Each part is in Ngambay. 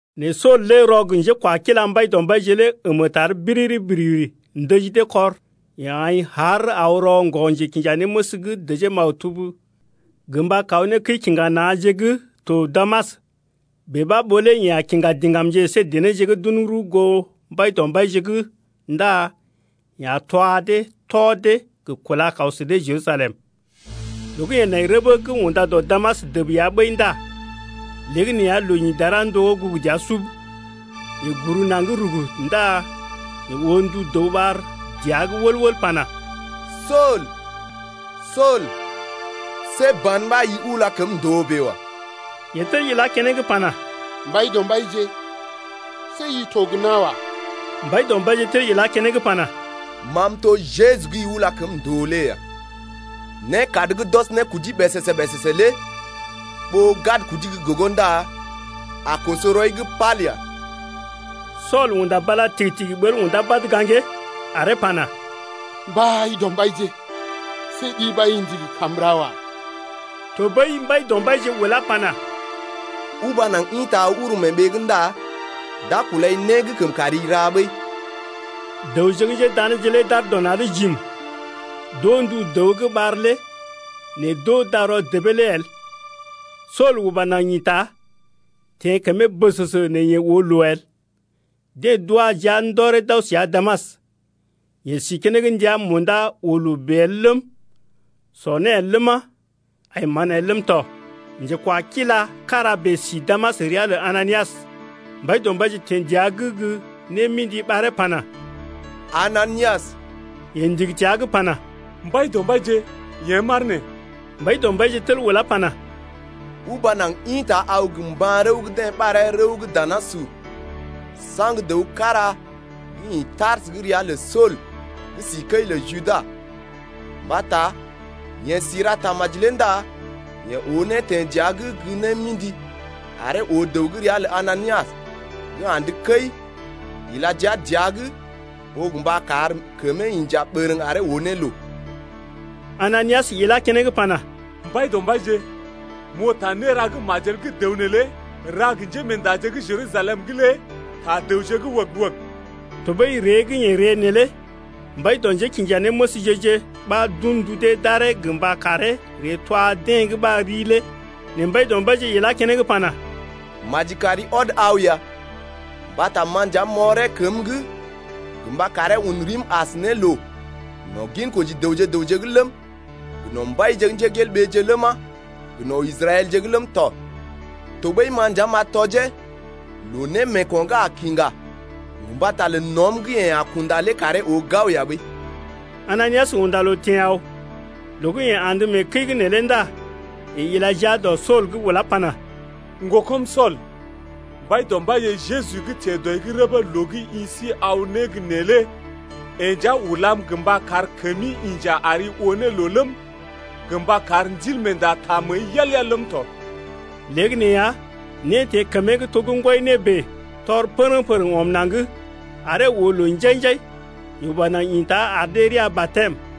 Nɛ Sool lé rɔ gə njékwakila lə Mbaidɔmbaije lé əmə tar biriri-biriri ndəji dee kɔr. Yeḛ aḭ haar aw rɔ ŋgɔ-njekinjanéməs’g dəjee maktub gə mba kaw ne kəi-kiŋga-na̰je’g gə́ to Damas, bèe ɓa ɓó lé yeḛ a kiŋga diŋgamje əsé denéje gə́ d’un rəw goo Mbaidɔmbaije’g ndá yeḛ a twa dee tɔ dee gə kúla kaw sə dee Jerusalem. Loo gə́ yeḛ nai rəbə gə́ unda dɔ Damas dəb ya ɓəi ndá léegəneeya loo ḭ dara ndogó gugu dəa sub. Yeḛ guru naŋg rug ndá yeḛ oo ndu dəw ɓar dəa’g wəl-wəl pana: Sool, Sool, see ban ɓa i ula kəm ndòo bèe wa. Yeḛ tel ilá keneŋ pana: Mbaidɔmbaije, see i to gə́ na̰ wa. Mbaidɔmbaije tel ilá keneŋ pana: Ma m’to gə́ Jeju gə́ i ula kəm ndòo lé ya. Nékad gə́ d’ɔs ne kudi ɓèsèsè-ɓèsèsè lé ɓó gad kudi gə́ gogo ndá a koso rɔi’g pal ya. Sool unda bala tigi-tigi ɓəl undá badə gaŋgee, aree pana: Mbaidɔmbaije, see ɗi ɓa i ndigi kam m’ra wa. Tɔɓəi Mbaidɔmbaije ulá pana: Uba naŋg ḭta aw uru mee ɓee’g ndá d’a kulai né gə́ kəm kari ra ɓəi. Dəwje gə́ njédaneeje lé d’aar dɔ na̰’d jim. D’oo ndu dəw gə́ ɓar lé nɛ d’oo darɔ debee lé el. Sool uba naŋg ḭta, teḛ kəmee bəsəsə nɛ yeḛ oo loo el. Deḛ d’wa jia ndɔree d’aw səa Damas. Yeḛ si keneŋ ndəa munda oo loo bèe el ləm, sɔ né el ləma, ai mán el ləm tɔ. Njekwakila kára bèe si Damas ria lə Ananias. Mbaidɔmbaije teḛ dəa’g gə́ némḭdi ɓaree pana: Ananias. Yeḛ ndigi təa’g pana: Mbaidɔmbaije, yḛ̀ m’aar nee. Mbaidɔmbaije tel ulá pana: Uba naŋg ḭta aw gə mban-rəw gə́ deḛ ɓaree Rəw gə́ danasur, saŋg dəw kára gə́ ḭ Tarsə gə́ ria lə Sool gə́ si kəi lə Judas. Mbata yeḛ si ra tamaji lé ndá yeḛ oo né teḛ dəa’g gə némḭdi aree oo dəw gə́ ria lə Ananias gə́ andə kəi ila jia dəa’g ɓó gə mba kar kəmee inja bərəŋ aree oo ne loo. Ananias ilá keneŋ pana: Mbaidɔmbaije, m’oo ta néra gə́ majel gə́ dəw neelé ra gə njémeendaje gə́ Jerusalem lé ta dəwje wəg-wəg. Tɔɓəi ree gə́ yeḛ ree neelé mbai dɔ njékinjanéməsje-je ɓa d’un ndu dee d’aree gə mba karee ree twa deḛ gə́ ɓar rii lé. Nɛ Mbaidɔmbaije ilá keneŋ pana: Maji kari ɔd aw ya mbata ma nja m’ɔree kəm’g gə mba karee un rim as ne loo no̰ ginkoji dəwje gə raŋg’g ləm, gə no̰ mbaije’g ləma, gə no̰ Israɛlje’g ləm tɔ. Tɔɓəi ma nja m’a tɔjee loo némeeko̰ gə́ a kiŋgá gə mbata lə no̰’m gə́ yeḛ a kunda lé karee oo gao ya ɓəi. Ananias unda loo teḛ aw. Loo gə́ yeḛ andə mee kəi’g neelé ndá yeḛ ila jia dɔ Sool’g ulá pana: Ŋgokɔm Sool, Mbaidɔmbaije Jeju gə́ teḛ dɔi’g rəbee loo gə́ i si aw ne gə́ nee lé yeḛ nja ulam gə mba kar kəmi inja ari oo ne loo ləm, gə mba kar Ndilmeenda taa məəi yal-yal ləm tɔ. Léegəneeya né teḛ kəmee’g to gə́ ŋgwɔi né bèe, tɔr pərəŋ-pərəŋ ɔm naŋg, aree oo loo njai-njai. Yeḛ uba naŋg ḭta ar dee rəa batɛm.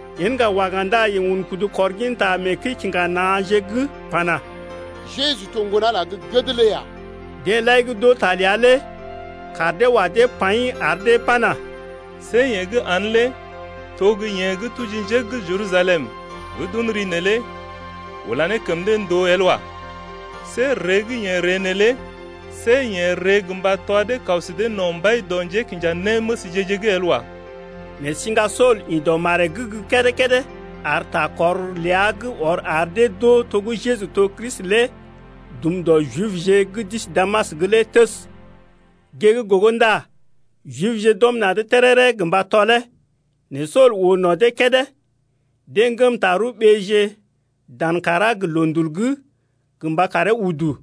Yen ŋga waga ndá yeḛ un kudu kɔr gin ta mee kəi-kiŋga-na̰je’g pana: Jeju to gə́ Ŋgon-Ala gə́ gəd lé ya. Deḛ lai gə́ d’oo ta ləa lé kaar dee wa dee paḭ ar dee pana: See yeḛ gə́ aa’n lé to gə́ yeḛ gə́ tuji njé gə́ Jerusalem gə́ d’un ri neelé ula ne kəm dee ndòo el wa. See ree gə́ yeḛ ree neelé see yeḛ ree gə mba twa dee kaw sə dee no̰ mbai dɔ njékinjanéməsje-je’g el wa. Nɛ siŋga Sool ḭ dɔ maree’g gə́ kédé-kédé ar ta kɔr ləa gə́ ɔr ar dee d’oo to gə́ Jeju to Kristi lé dum dɔ Jibje gə́ d’isi Damas’g lé təs. Gée gə́ gogo ndá Jibje d’ɔm na̰’d téréré gə mba tɔlee. Nɛ Sool oo no̰ dee kédé. Deḛ ŋgəm tarəw ɓeeje dan kàrá gə loondul’g gə mba karee udu.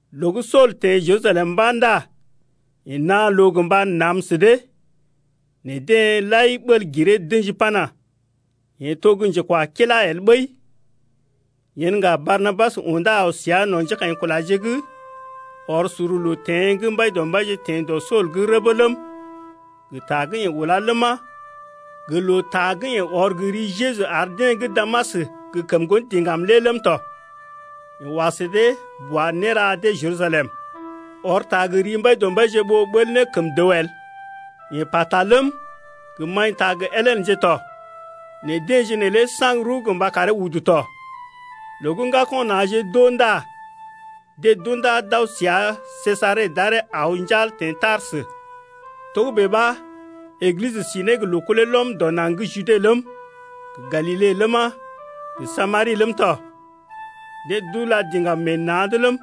Loo gə́ Sool teḛ Jerusalem mba̰ ndá yeḛ naa loo gə mba nam sə dee, nɛ deḛ lai ɓəl giree d’ə̰ji pana: Yeḛ to gə́ njekwakila el ɓəi. Yen ŋga Barnabas undá aw səa no̰ njékaḭkulaje’g, ɔr sor loo teḛ gə́ Mbaidɔmbaije teḛ dɔ Sool’g rəbə ləm, gə ta gə́ yeḛ ulá ləma, gə loo ta gə́ yeḛ ɔr gə ri Jeju ar deḛ gə́ Damas gə kəm ŋgon diŋgam lé ləm tɔ. Yeḛ wa sə dee boa néra dee Jerusalem, ɔr ta gə ri Mbaidɔmbaije ɓó ɓəl ne kəm dəw el. Yeḛ pata ləm, gə maḭta gə Helenje ləm tɔ, nɛ deḛje neelé saŋg rəw gə mba karee udu tɔ. Loo gə́ ŋgako̰ na̰je d’oo ndá deḛ d’undá d’aw səa Sejare d’aree aw njal teḛ Tarsə. Togə́bè ɓa Eglisə si ne gə loo kulee lɔm dɔ naŋg gə́ Jude ləm, gə Galile ləma, gə Samari ləm tɔ. Deḛ d’ula diŋgam meḛ na̰’d ləm,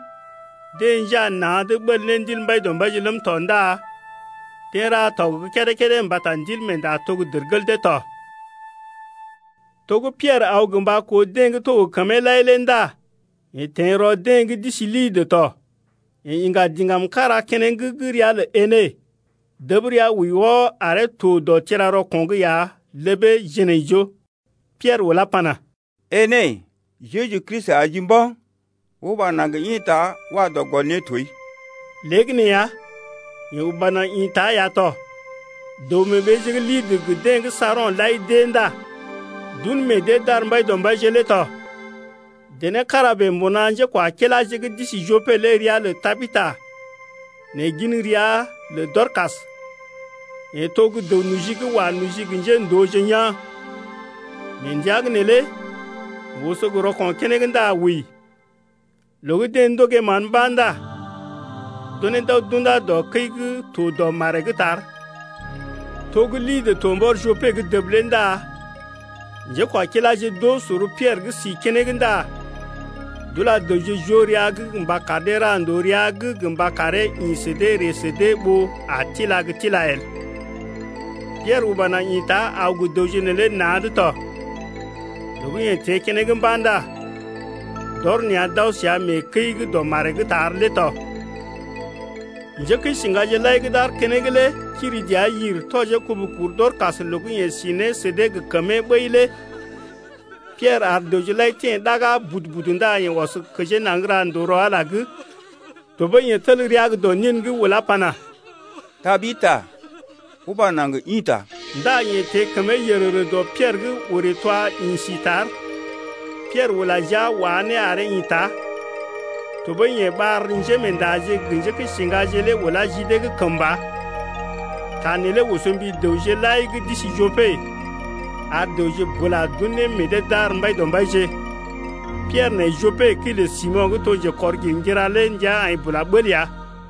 deḛ njaa na̰’d ɓəl ne Ndil Mbaidɔmbaije ləm tɔ ndá deḛ ra tɔg gə́ kédé-kédé mbata Ndilmeenda to gə́ dərgel dee tɔ. To gə́ Piɛrə aw gə mba koo deḛ gə́ to gə kəmee lai lé ndá yeḛ teḛ rɔ deḛ gə́ d’isi Lidə tɔ. Yeḛ iŋga diŋgam kára keneŋ gə́ ria lə Enée, dəb rəa wəi wɔ aree to dɔ tira-rɔko̰’g ya ləbee jinaijoo. Piɛrə ulá pana: Enée, Jeju Kristi ajii mba̰, uba naŋg ḭta wa dɔ gɔl nétoi. Léegəneeya yeḛ uba naŋg ḭta ya tɔ. Dəw-mee-ɓeeje gə́ Lidə gə deḛ gə́ Saron lai d’ée ndá d’un meḛ dee d’ar Mbaidɔmbaije lé tɔ. Dené kára bèe mbuna njékwakilaje gə́ d’isi Jope lé ria lə Tabida nɛ gin ria lə Dɔrkas, yeḛ to gə́ dəw-noji gə́ wa noji gə njéndooje yaa̰. Mee ndəa’g neelé yeḛ oso gə rɔko̰ keneŋ ndá wəi. Loo gə́ deḛ ndogee mán mba̰ ndá d’unee d’aw d’unda dɔ kəi gə́ to dɔ maree’g tar. To gə́ Lidə to mbɔr Jope’g dəb lé ndá njékwakiláje d’oo sor Piɛrə gə́ si keneŋ ndá d’ula dəwje joo rəa’g mba kar dee ra ndòo rəa’g gə mba karee ḭ sə dee ree sə dee ɓó a tila gə́ tila el. Piɛrə uba naŋg ḭta aw gə dəwje neelé na̰’d tɔ. Loo gə́ yeḛ teḛ keneŋ mba̰ ndá d’ɔr nea̰ d’aw səa mee kəi gə́ dɔ maree’g tar lé tɔ. Njékəisiŋgaje lai gə́ d’aar keneŋ lé kiri dəa yir tɔjee kubu kur Dɔrkas loo gə́ yeḛ si ne sə dee gə kəmee ɓəi lé. Piɛrə ar dəwje lai teḛ ɗaga budu-budu ndá yeḛ ɔs kəjee naŋg ra ndòo rɔ Ala’g. Tɔɓəi yeḛ tel rəa gə́ dɔ nin’g ulá pana: Tabida, uba naŋg ḭta! Ndá yeḛ teḛ kəmee yərərə dɔ Piɛrə’g orè twa ḭ si tar. Piɛrə ula jia wá ne aree ḭta. Tɔɓəi yeḛ ɓar njémeendaje gə njékəisiŋgaje lé ulá ji dee’g kəmba. Ta neelé oso mbi dəwje lai gə́ d’isi Jope, ar dəwje bula d’un ne meḛ dee d’ar Mbaidɔmbaije. Piɛrə nai Jope kəi lə Simo̰ gə́ njekɔr-girŋgira lé ndəa aḭ bula bəl ya.